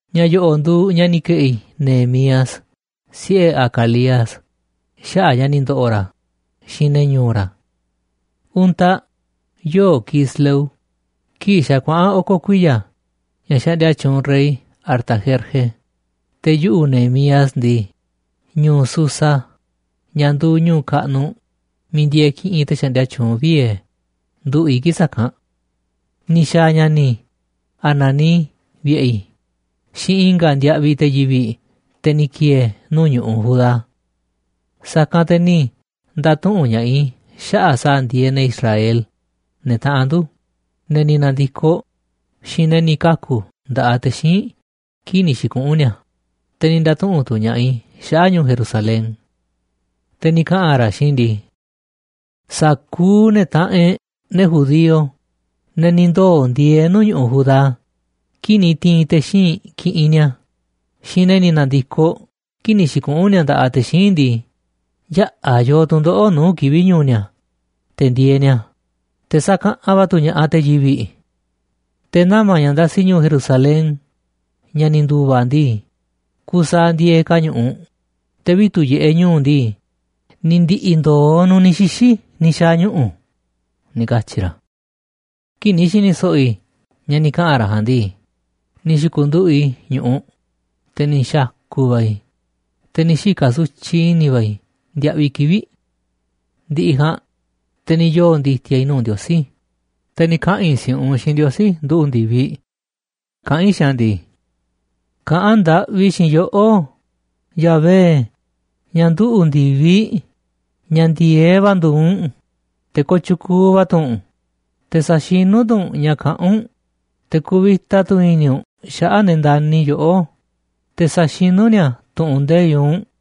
Ña̱ yo̱ꞌo̱ꞌ nduuꞌ ña̱ ni̱ ke̱ꞌi̱ Nehemías, siꞌe̱ Hacalías, xaꞌa̱ꞌ ña̱ ni̱ ndo̱ꞌo̱ ra̱, xiinꞌ ne̱ ñu̱u̱ ra̱. Untaꞌ, yoo̱ꞌ Quisleu kii̱ꞌ xa̱ kuaꞌa̱n oko̱ kuiya̱ ña̱ xaꞌndia tyuunꞌ rey Artajerje, te̱ yuꞌu̱, Nehemías ndii, ñu̱u̱ Susa, ña̱ nduuꞌ ñu̱u̱ kaꞌnuꞌ miiꞌ ndieeꞌ kiꞌinꞌ te̱ xaꞌndia tyuunꞌ vie̱, nduꞌu̱ꞌ i̱ kii̱ꞌ sa̱kanꞌ. Ni̱ xa̱a̱ ña̱ni̱ i̱ Hanani vi̱ꞌe̱ i̱ xiinꞌ i̱nga̱ ndiaꞌviꞌ te̱ yivi̱ꞌ, te̱ ni̱ ki̱e̱e̱ nuu̱ꞌ ñu̱ꞌuꞌ Judá. Sa̱kanꞌ te̱ ni̱ nda̱tuꞌu̱nꞌ ña̱ꞌaꞌ i̱ xaꞌa̱ꞌ sa̱a̱ ndieeꞌ ne̱ Israel, ne̱ taꞌanꞌ ndu̱, ne̱ ni̱ na̱ndi̱koꞌ, xiinꞌ ne̱ ni̱ kaku̱ nda̱ꞌaꞌ te̱ xíinꞌ kii̱ꞌ ni̱ xi̱kuꞌu̱n ni̱a̱. Te̱ ni̱ nda̱tuꞌu̱nꞌ tu̱ ña̱ꞌaꞌ i̱ xaꞌa̱ꞌ ñu̱u̱ Jerusalén. Te̱ ni̱ kaꞌa̱n ra̱ xiinꞌ i̱ ndii: ―Sa̱kuuꞌ ne̱ taꞌanꞌ e̱ꞌ, ne̱ judío, ne̱ ni̱ ndoo̱ ndieeꞌ nuu̱ꞌ ñu̱ꞌuꞌ Judá kii̱ꞌ ni̱ ti̱i̱n te̱ xíinꞌ kiꞌinꞌ ni̱a̱, xiinꞌ ne̱ ni̱ na̱ndi̱koꞌ kii̱ꞌ ni̱ xi̱kuꞌu̱n ni̱a̱ nda̱ꞌaꞌ te̱ xíinꞌ ndii, yaꞌa̱ yoo tu̱ndoꞌo̱ꞌ nuu̱ꞌ kivi̱ꞌ ñu̱u̱ ni̱a̱ te̱ ndieeꞌ ni̱a̱, te̱ sakaꞌanꞌ va̱ tu̱ ña̱ꞌaꞌ te̱ yivi̱ꞌ. Te̱ nama̱ ña̱ ndasi ñu̱u̱ Jerusalén, ña̱ ni̱ ndu̱va̱ ndii, kusaaꞌ ndieeꞌ ka̱ a̱ ñu̱ꞌuꞌ, te̱ vitu̱ꞌ yiꞌeꞌ ñu̱u̱ ndii, ni̱ ndi̱ꞌi̱ ndoo nu̱ꞌ ni̱ xixi̱ ni̱ xa̱a̱ ñuꞌu̱ ―ni̱ katyi̱ ra̱. Kii̱ꞌ ni̱ xi̱ni̱ so̱ꞌo̱ i̱ ña̱ ni̱ kaꞌa̱n ra̱ ja̱a̱nꞌ ndii, ni̱ xi̱ku̱nduꞌu̱ꞌ i̱ ñu̱ꞌuꞌ, te̱ ni̱ xa̱ku̱ va̱ i̱, te̱ ni̱ xika̱ sutyiꞌ i̱ni̱ va̱ i̱ ndiaꞌviꞌ kivi̱ꞌ. Ndi̱ꞌi̱ ja̱a̱nꞌ, te̱ ni̱ yoo̱ ndi̱ti̱a̱ i̱ nuu̱ꞌ Ndiosí, te̱ ni̱ kaꞌa̱n i̱ si̱ꞌunꞌ xiinꞌ Ndiosí, nduꞌu̱ꞌ ndi̱viꞌ, kaꞌán i̱ xiinꞌ a̱ ndii: ―Kaꞌán ndaꞌvi i̱ xiinꞌ yoꞌó, Yahvé, ña̱ nduꞌu̱ ndi̱viꞌ, ña̱ ndi̱e̱eꞌ va̱ nduuꞌ u̱nꞌ, te̱ kooꞌ tyukuuꞌ va̱ tu̱ u̱nꞌ, te̱ saxinu̱ tu̱ u̱nꞌ ña̱ kaꞌán u̱nꞌ, te̱ kuvita tu̱ i̱ni̱ u̱nꞌ xaꞌa̱ꞌ ne̱ ndani̱ yoꞌó, te̱ saxinu̱ ni̱a̱ tu̱ꞌu̱n nde̱iꞌ u̱nꞌ.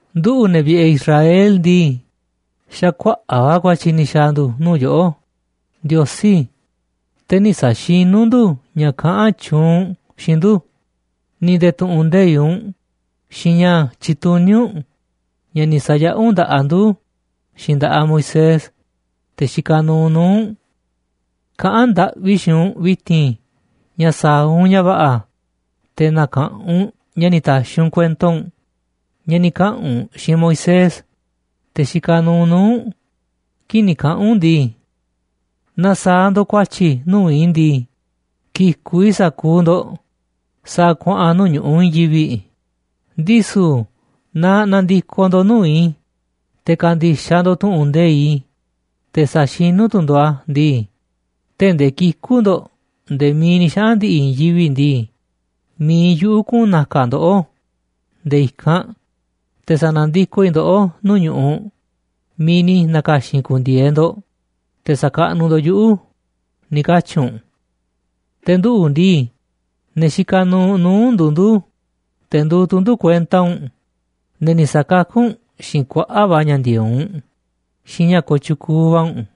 Nduꞌu̱, ne̱ vi̱ꞌe̱ Israel ndii, xa̱ kuaꞌa̱ꞌ va̱ ku̱a̱tyi̱ ni̱ xa̱a̱ ndu̱ nuu̱ꞌ yoꞌó, Ndiosí, te̱ nï̱ sa̱xinú ndu̱ ña̱ kaꞌán tyuunꞌ u̱nꞌ xiinꞌ ndu̱, ni̱ nde̱e̱ tu̱ꞌu̱n nde̱iꞌ u̱nꞌ xiinꞌ ña̱ tyituní u̱nꞌ, ña̱ ni̱ sa̱yaꞌá u̱nꞌ nda̱ꞌaꞌ ndu xiinꞌ nda̱ꞌaꞌ Moisés, te̱ xikaꞌ nuuꞌ nuu̱ꞌ u̱nꞌ. Kaꞌán ndaꞌvi i̱ xiinꞌ u̱nꞌ vi̱ti̱n ña̱ sa̱a̱ u̱nꞌ ña̱ va̱ꞌa̱ te̱ na̱ka̱ꞌanꞌ u̱nꞌ ña̱ ni̱ ta̱xi̱ u̱nꞌ kuento u̱nꞌ, ña̱ ni̱ kaꞌa̱n u̱nꞌ xiinꞌ Moisés, te̱ xikaꞌ nuuꞌ nuu̱ꞌ u̱nꞌ, kii̱ꞌ ni̱ kaꞌa̱n u̱nꞌ ndii: “Naaꞌ sa̱a̱ ndo̱ꞌ ku̱a̱tyi̱ nuu̱ꞌ i̱ ndii, ki̱ku̱ꞌ i̱ sa̱kuuꞌ ndo̱ꞌ sa̱a̱ kuaꞌa̱n nuu̱ꞌ ñu̱ꞌuꞌ i̱i̱n yivi̱ꞌ, ndisu̱ naaꞌ na̱ndi̱koꞌ ndo̱ꞌ nuu̱ꞌ i̱, te̱ ka̱ndi̱xaꞌ ndo̱ꞌ tu̱ꞌu̱n nde̱iꞌ i̱, te̱ sa̱xinu̱ tu̱ ndo̱ꞌ a̱ ndii, tee̱ꞌ ndee kiku̱ ndo̱ꞌ nde̱e̱ miiꞌ ni̱ xaꞌa̱n ndi̱ꞌi̱ i̱i̱n yivi̱ꞌ ndii, mi̱iꞌ yuꞌu̱ kuꞌu̱n na̱ka̱ ndoꞌó nde̱e̱ i̱kanꞌ, te̱ sa̱na̱ndikoꞌ i̱ ndoꞌó nuu̱ꞌ ñu̱ꞌuꞌ miiꞌ ni̱ na̱ka̱xi̱n i̱ ku̱ndi̱e̱e̱ ndo̱ꞌ te̱ sa̱kaꞌnuꞌ ndo̱ꞌ yuꞌu̱,” ni̱ katyi̱ u̱nꞌ. Te̱ nduꞌu̱ ndii, ne̱ xikaꞌ nuuꞌ nuu̱ꞌ u̱nꞌ nduuꞌ ndu̱, te̱ nduuꞌ tu̱ ndu̱ kuenta u̱nꞌ, ne̱ ni̱ sa̱kakú u̱nꞌ xiinꞌ kuaꞌa̱ꞌ va̱ ña̱ ndi̱e̱eꞌ u̱nꞌ xiinꞌ ña̱ kooꞌ tyukuuꞌ va̱ u̱nꞌ.